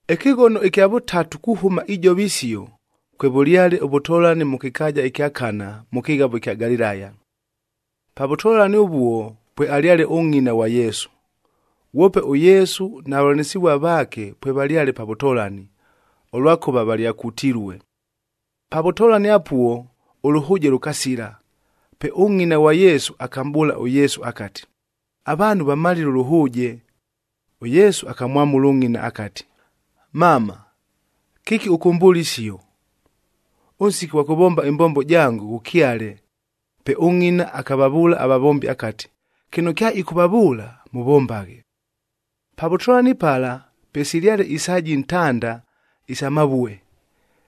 Ɨkɨghono ɨkya vʉtatu kuhʉma ijova isio, kwevʉlyale ʉvʉtolani mʉ kɨkaaja ɨkya Kana, mʉ kɨghavo ɨkya Galilaya. Pa vʉtolani ʉvuo pwealyale ʉngʼina ghwa Yesu. Ghwope ʉYesu na vavʉlanɨsɨvua vaake pwevalyale pa vʉtolani, ʉlwakʉva valyakutilue. Pa vʉtolani apuo ʉlʉhʉʉjea lʉkasila, pe ʉngʼina ghwa Yesu akamʼbʉʉla ʉYesu akati, “Avaanhu vamalile ʉlʉhʉʉje.” ɄYesu akamwamʉla ʉngʼina akati, “Mama, kɨki ʉkʉmbʉʉla isio? Ʉnsiki ʉghwa kʉvomba ɨmbombo jango ghʉkyale.” Pe ʉngʼina akavavʉʉla avavombi akati, “Kɨno kyaɨkʉvavʉʉla, mʉvombaghe.” Pa vʉtolani pala, pwesilyale isaaji ntanda isa mavue.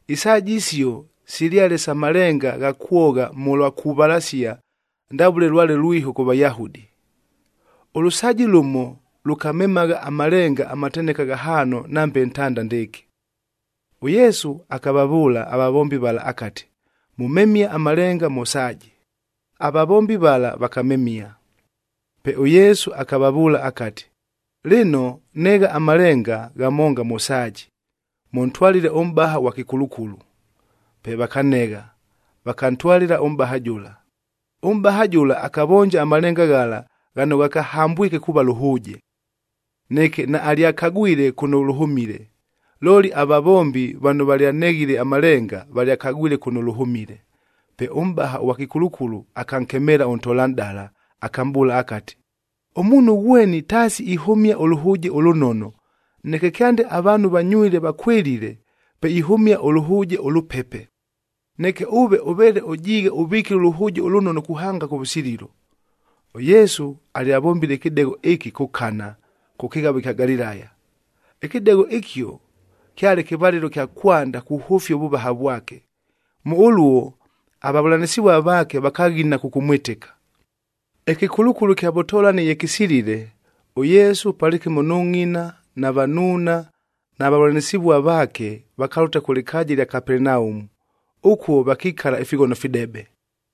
Isaaji isio silyale sa malenga agha kwogha mʉlwa kuvalasia ndavʉle lwale lwiho kʉ Vayahudi. Ʉlʉsaaji lʉmo lʉkamemagha amalenga amateneka ghahaano nambe ntanda ndɨɨkɨ. ɄYesu akavavʉʉla avavombi vala akati, “Mʉmemie amalenga mʉ saaji.” Avavombi vala vakamemia. Pe ʉYesu akavavʉʉla akati, “Lɨno, negha amalenga ghamonga mʉ saaji, mʉntwalɨle ʉmʼbaha ʉghwa kɨkulukulu.” Pe vakanegha, vakantwalɨla ʉmʼbaha jʉla. Ʉmʼbaha jʉla akavonja amalenga ghala, ghano ghakahambwike kuuva lʉhʉʉje. Neke naalyakagwile kʉno lʉhʉmile, looli avavombi vano valyaneghile amalenga, valyakagwile kʉno lʉhʉmile. Pe ʉmʼbaha ʉghwa kɨkulukulu akankemeela ʉntolanʼdala, akamʼbʉʉla akati, “Ʉmuunhu ghweni taasi ihʉmia ʉlʉhʉʉje ʉlʉnono, neke kyande avaanhu vanywile vakwɨlile, pe ihʉmia ʉlʉhʉʉje ʉlʉpepe. Neke ʉve ʉveele ʉjiighe ʉvikile ʉlʉhʉʉje ʉlʉnono kuhanga kʉvʉsililo!” ɄYesu alyavombile ɨkɨdegho ɨkɨ kʉ Kana, kʉ kɨghavo ɨkya Galilaya. Ɨkɨdegho ɨkio kyale kɨvalɨlo kya kwanda kuhʉfia ʉvʉvaha vwake. Mʉ ʉluo avavʉlanɨsɨvua vaake vakaghina kʉkʉmwɨtɨka. Ɨkɨkulukulu kya vʉtolani ye kɨsilile, ʉYesu palɨkɨmo nʉ ngʼina na vanuuna na vavʉlanɨsɨvua vaake vakalʉta kʉ lɨkaaja ɨlya Kapelenaumu. Ʉkuo vakikala ifighono fidebe.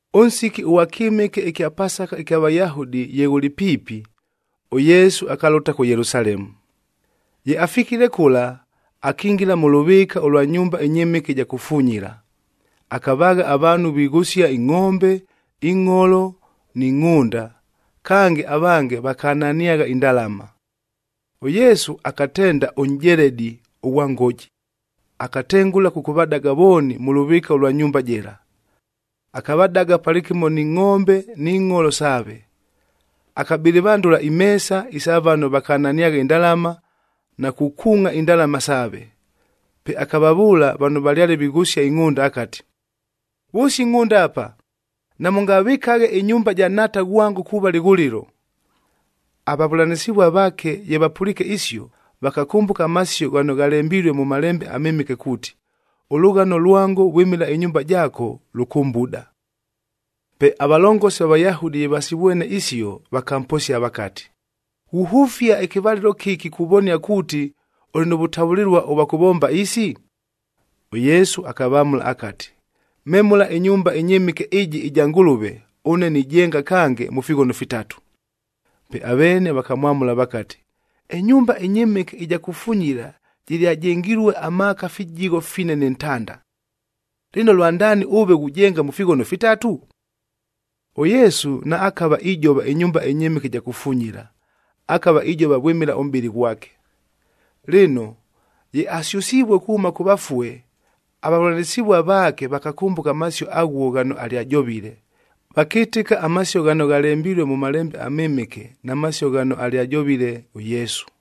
Ʉnsiki ʉghwa kyɨmɨke ɨkya Pasakab ɨkya Vayahudi ye ghʉlɨ piipi, ʉYesu akalʉta kʉ Yelusalemu. Ye afikile kʉla, akingila mʉ lʉvɨɨka ʉlwa nyumba ɨnyɨmɨke ɨja kufunyila,c akavaagha avaanhu vighʉsia ingʼombe, ingʼholo ni ngʼhʉnda, kange avange vakananiagha indalama. ɄYesu akatenda ʉnʼjeledi ʉghwa ngoji, akatengʉla kʉkʉvadaga vooni mʉ lʉvɨɨka ʉlwa nyumba jɨla. Akavadaga palɨkɨmo ni ngʼombe ni ngʼholo saave. Akabɨlɨvandʉla imeesa isa vano vakananiagha indalama na kukuungʼa indalama saave. Pe akavavʉʉla vano valyale vighʉsia ingʼhʉnda akati, “Vʉsia ingʼhʉnda apa. Namʉngavɨkaghe ɨnyumba ja Nhaata ghwango kuuva lɨghʉlɨlo.” Avavʉlanɨsɨvua vaake ye vapʉliike isio, vakakʉmbʉka amasio ghano ghalembilue mʉ Malembe aMɨmɨke kuuti, “Ʉlʉghano lwango vwɨmɨla ɨnyumba jaako, Pe avalongosi va Vayahudi ye vasivwene isio, vakamposia vakati, “Ghuhʉfia ɨkɨvalɨlo kɨki kuvonia kuuti, ʉlɨ nʉ vʉtavʉlɨlua ʉvwa kʉvomba isi?” ɄYesu akavamʉla akati, “Memʉla ɨnyumba ɨnyɨmɨke ɨjɨ ɨja Ngʉlʉve, ʉne nijenga kange mʉ fighono fitatu.” Pe aveene vakamwamʉla vakati, “Ɨnyumba ɨnyɨmɨke ɨja kufunyila jɨlyajengilue amaaka fijigho fine nɨ ntanda. Lɨno, lwandaani ʉve ghujenga mʉ fighono fitatu?” ɄYesu naakava ijova ɨnyumba ɨnyɨmɨke ɨja kufunyila, akava ijova vwɨmɨla ʉmʼbɨlɨ ghwake. Lɨno, ye asyʉsivue kuhʉma kʉ vafue, avavʉlanɨsɨvua vaake vakakʉmbʉka amasio aghuo ghano alyajovile, vakɨtɨka amasio ghano ghalembilue mʉ Malembe aMɨmɨke na masio ghano alyajovile ʉYesu.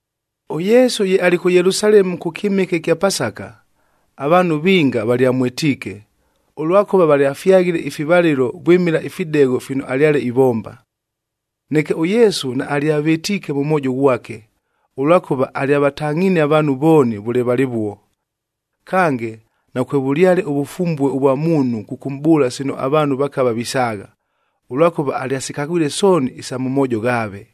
ɄYesu ye alɨ kʉ Yelusalemu kʉ kyɨmɨke ɨkya Pasaka, avaanhu vinga valyamwɨtiike, ʉlwakʉva valyafyaghile ifivalɨlo vwɨmɨla ifidegho fino alyale ivomba. Neke ʉYesu naalyavɨtiike mʉ mwojo ghwake, ʉlwakʉva alyavatangʼhinie avaanhu vooni vʉle valɨvuo. Kange, nakwevʉlyale ʉvʉfumbue ʉvwa muunhu kʉkʉmʼbʉʉla sino avaanhu vakava visaagha, ʉlwakʉva alyasikagwile sooni isa mʉ moojo ghaave.